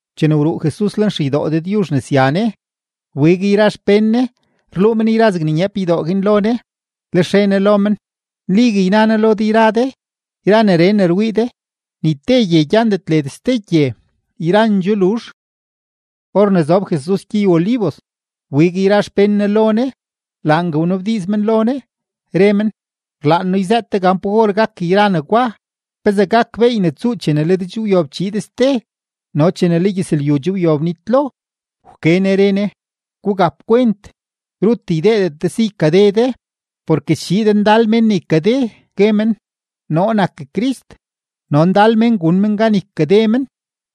Chene wruu Jesus lenxeydoo Dëdyuzh ne sya Ne, wbig yra xpén Ne rluu men yra zegne nyeep ydoo guin lo Ne. Lex re Ne lo men: ―Nligue yna noo lo de, yra neree ne rwii de, ni te gye gyandet led ste gye, yrandxoo luzh. Or ne zob Jesus gyey-Olivos, wbig yra xpén Ne lo Ne, laangue wnabdiiz men lo Ne, re men: ―Rlaan noo yzëët de gan pa or gak yra negwa. ¿Pezee gak beey ne tsuu chene le de che wyob chiid ste no chene le gyëzlyu che wyob nitlo? Wke Ne re Ne: ―Gugap kwent, rut ydeedet de si ykade de. Porke schiid ndal mén ne ykade, gue men: “Noo nak Crist”; no ndal mén gun men gan ykade men.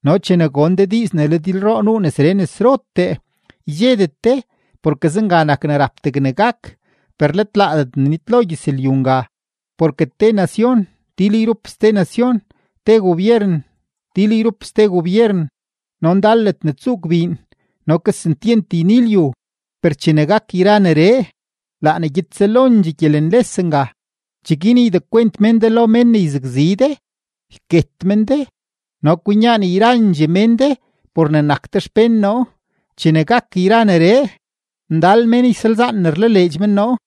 No chene gon de diiz ne le dilroo nuu nesree nesrotee, ydxedet de, porke zenga nak ne rap degne gak; per let laadet ne nitlo gyëzlyu nga. Porke te nacion til yrup ste nacion, te gobyeren til yrup ste gobyeren, no ndal ledne tsuu gbiin no kesentyent yni lyu. Per chene gak yra neree, laa ne gyed selondxee gyelenles nga. ’Cheguin ydekwent mén de lo mén ne yzakzi de, yket men de, no kwinyaan yrandxee mén de por ne nak de xpén noo. Chene gak yra neree, ndal mén ysalzaan ne rlaleedx men noo;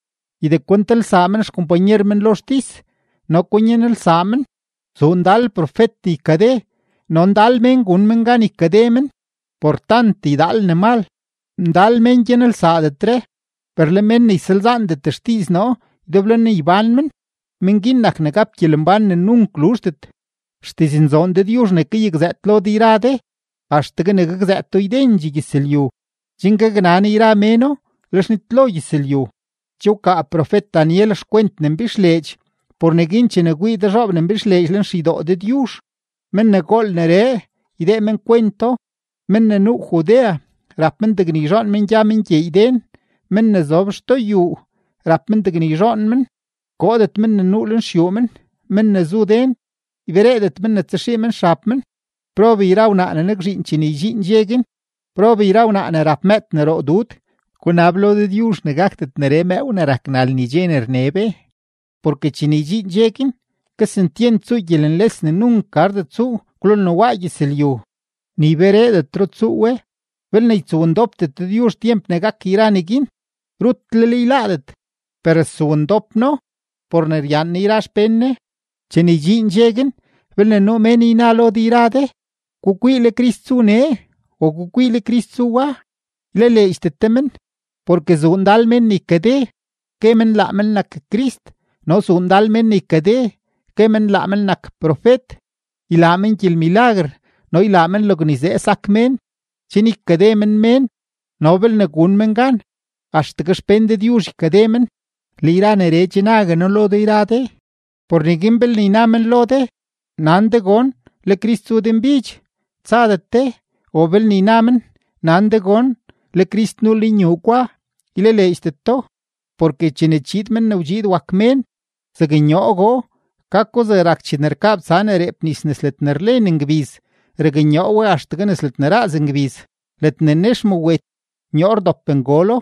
ydekwentelsaa men xkompanyer men lo xtis no kwinyanelsaa men. Zuu ndal profet ne ykade no ndal mén gun men gan ykade men. Por tant ydaal ne mal, ndal mén gyanelsaadetre. Per le mén ne ysalzaandet xdiiz noo ydeblo ne ybán men, men guin nak ne gap gyelembán ne nunk luzhdet. Xdiznzoon Dëdyuzh ne kayakzëët lo de yra de, axtegue ne gakzëëto ydendxee gyëzlyu chen gaknan yrandxee méno; lex nitlo gyëzlyu. ’Che wkaa profet-Daniel xkwent ne mbixleedx; por neguin chene kwii de zhoob ne mbixleedx lenxeydoo Dëdyuzh (men ne gool neree, ydee men kwento), men ne nuu Judea rap men degne yzhoon men gya men gyeey den. Men ne zob xtoo xyuu rap men degne yzhoon men, koodet men ne nuu lenxyuu men; men ne zu den ybereedet men tsaxii men xab men. ¡Prob yra wnaa ne nakzhiin chene ydxiin dxe guin! ¡Prob yra wnaa ne rap mëëd ne roo dud! Gunab lo Dëdyuzh ne gakdet neree mëëw ne rak nal ni dxe ne rne be. Porke chene ydxiin dxe guin, kesentyent tsuu gyelenles ne nunk gardet tsuu kwlolne waa gyëzlyu, ni ybereedetro tsuu we. Belne ytsowndopdet Dëdyuzh tyemp ne gak yra neguin, rutlel yláádet; per stsowndop No por ne ryaan Ne yra xpén Ne. ’Chene ydxiin dxe guin, belne nuu mén yna lo de yra de: “Gukwii, le Crist zu nee”, o “Gukwii, le Crist zu wa”, ylaleedxdet de men. Porke zuu ndal mén ne ykade, gue men laa men nak Crist, no zuu ndal mén ne ykade, gue men laa men nak profet; ylaa men gyelmilaguer no ylaa men logne yzee sak mén, chen ykade men mén no belne gun men gan, axtegue xpén Dëdyuzh ykade men. Le yra neree che nague noo lo de yra de. Por neguin belne yna men lo de: “Nan de gon, le Crist zu denbidx”, tsadet de; o belne yna men: “Nan de gon, le Crist nuu lenyuu gwa”, ylaleedxdet do. Porke chene chiid Men ne wdxiid wak Mén, zaknyoogoo, gako zegne rak chene rkabtsa ne reep nis nes ledne rlen ngbiz raknyoo we axtegue nes ledne raaz ngbiz. Ledne nex mawet, nyoo rdop ngolo.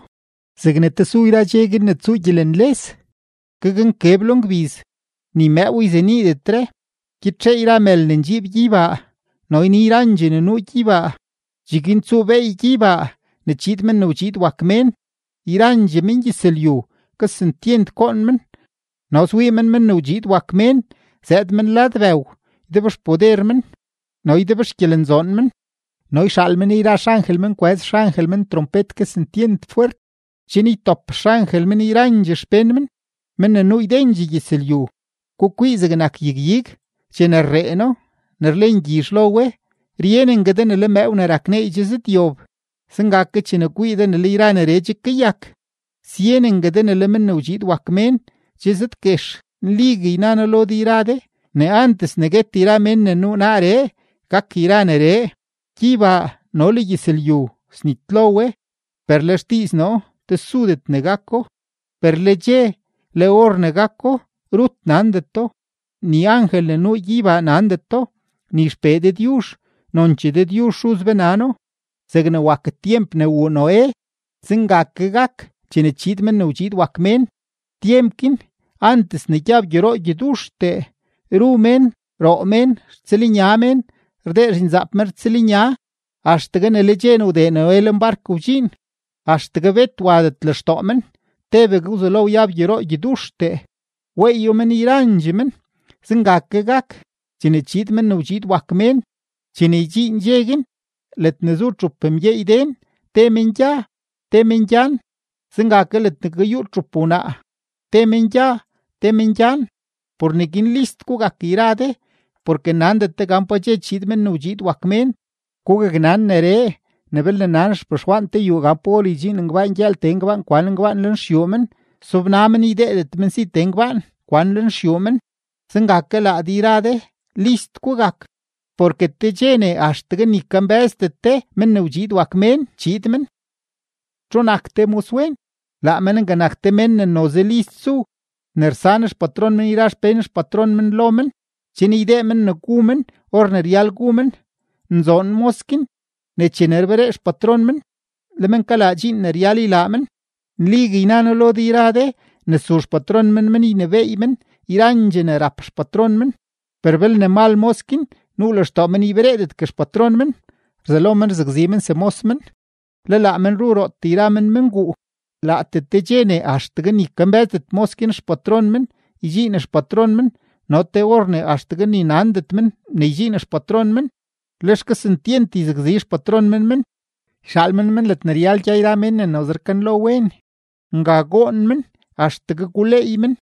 ’Zegne tesu yra dxe guin ne tsuu gyelenles, gaknkeb lo ngbiz, ni mëëw yzeniidetre, gyitxee yra mël ne ndxiib gyeybaa, no yni yrandxee ne nuu gyeybaa. Cheguin tsuu beey gyeybaa ne chiid Men ne wdxiid wak Mén. Yrandxee mengyëzlyu kesentyent goon men no swii men Men ne wdxiid wak Mén zëëd men lad bëw ydebxpoder men no ydebxgyelenzoon men. No yxaal men yra xangel men kwëz xangel men trompet kesentyent fwert, chen ytop xangel men yrandxee xpén men, men ne nuu ydendxee gyëzlyu. ’Gukwii zegnak yag-ig: Chene rreeno ne rlen gyizh lo we, ryenengue de ne le mëëw ne rak neey che zëdyob. Zenga ke chene kwii de ne le yra neree che kayak, syenengue de ne le Men ne wdxiid wak Mén che zëdguex. Nligue yna noo lo de yra de ne antes ne guet yra mén ne nuu naaree, gak yra neree. Gyeybaa no le gyëzlyu snitlo we, per le xdiiz noo tesudet ne gako. ’Per le dxe, le or ne gako, rut nandeto, ni angel ne nuu gyeybaa nandeto, ni XPee Dëdyuzh. Nonchee Dëdyuzh Xuz be nano. ’Zegne wak tyemp ne wuu Noé, zenga ke gak chene chiid Men ne wdxiid wak Mén. Tyemp guin, antes ne gyab gyoroo gyoduxtee, ru mén, roo mén, rtsëlnya mén, rdee zhinzaap men rtsëlnya, axtegue ne le dxe ne wdee Noé lenbark wdxiin. Axtegue bet wadet lextoo men, tebegue wzelo wyab gyoroo gyoduxtee, weeyo men yrandxee men. Zenga ke gak chene chiid Men ne wdxiid wak Mén. Chene ydxiin dxe guin, ledne zu txup mgyeey den, te men gya, te men gyan. Zenga ke ledne kayuut txup wnaa, te men gya, te men gyan. ’Por neguin list gugak yra de, porke nandet de gan pa dxe chiid Men ne wdxiid wak Mén. Gugaknan neree, ne belne nan xpexwaan te yuu gan pa or ydxiin ngbaan gyëël tee ngbaan kwan ngbaan lenxyuu men, sobna men ydeedet men si tee ngbaan kwan lenxyuu men. Zenga ke laa de yra de, list gugak; porke te dxe ne axtegue ni kambë́zdet de Men ne wdxiid wak Mén, chiid men. ’¿Txu nak te moswen? Laa men nga nak te men ne noze list zu ne rsan xpatron men yra xpén xpatron men lo men chen ydee men ne gu men or ne ryal gu men. Nzoon mos guin ne chene rberee xpatron men, le men kalaa dxiin ne ryal ylaa men. Nligue yna noo lo de yra de ne su xpatron men men ynebééy men yrandxee ne rap xpatron men. Per belne mal mos guin, nuu lextoo men ybereedetgue xpatron men, rzelo men rzakzi men semos men, le laa men ru rootee yra men menguu. Laatee te dxe ne axtegue ni kambë́zdet mos guin xpatron men, ydxiin xpatron men no te or ne axtegue ni nandet men ne ydxiin xpatron men. Lex kesentyent yzakzi xpatron men men, yxaal men men ledne ryal gya yra mén ne noze rkanlo wen; nga goon men axtegue guleey men.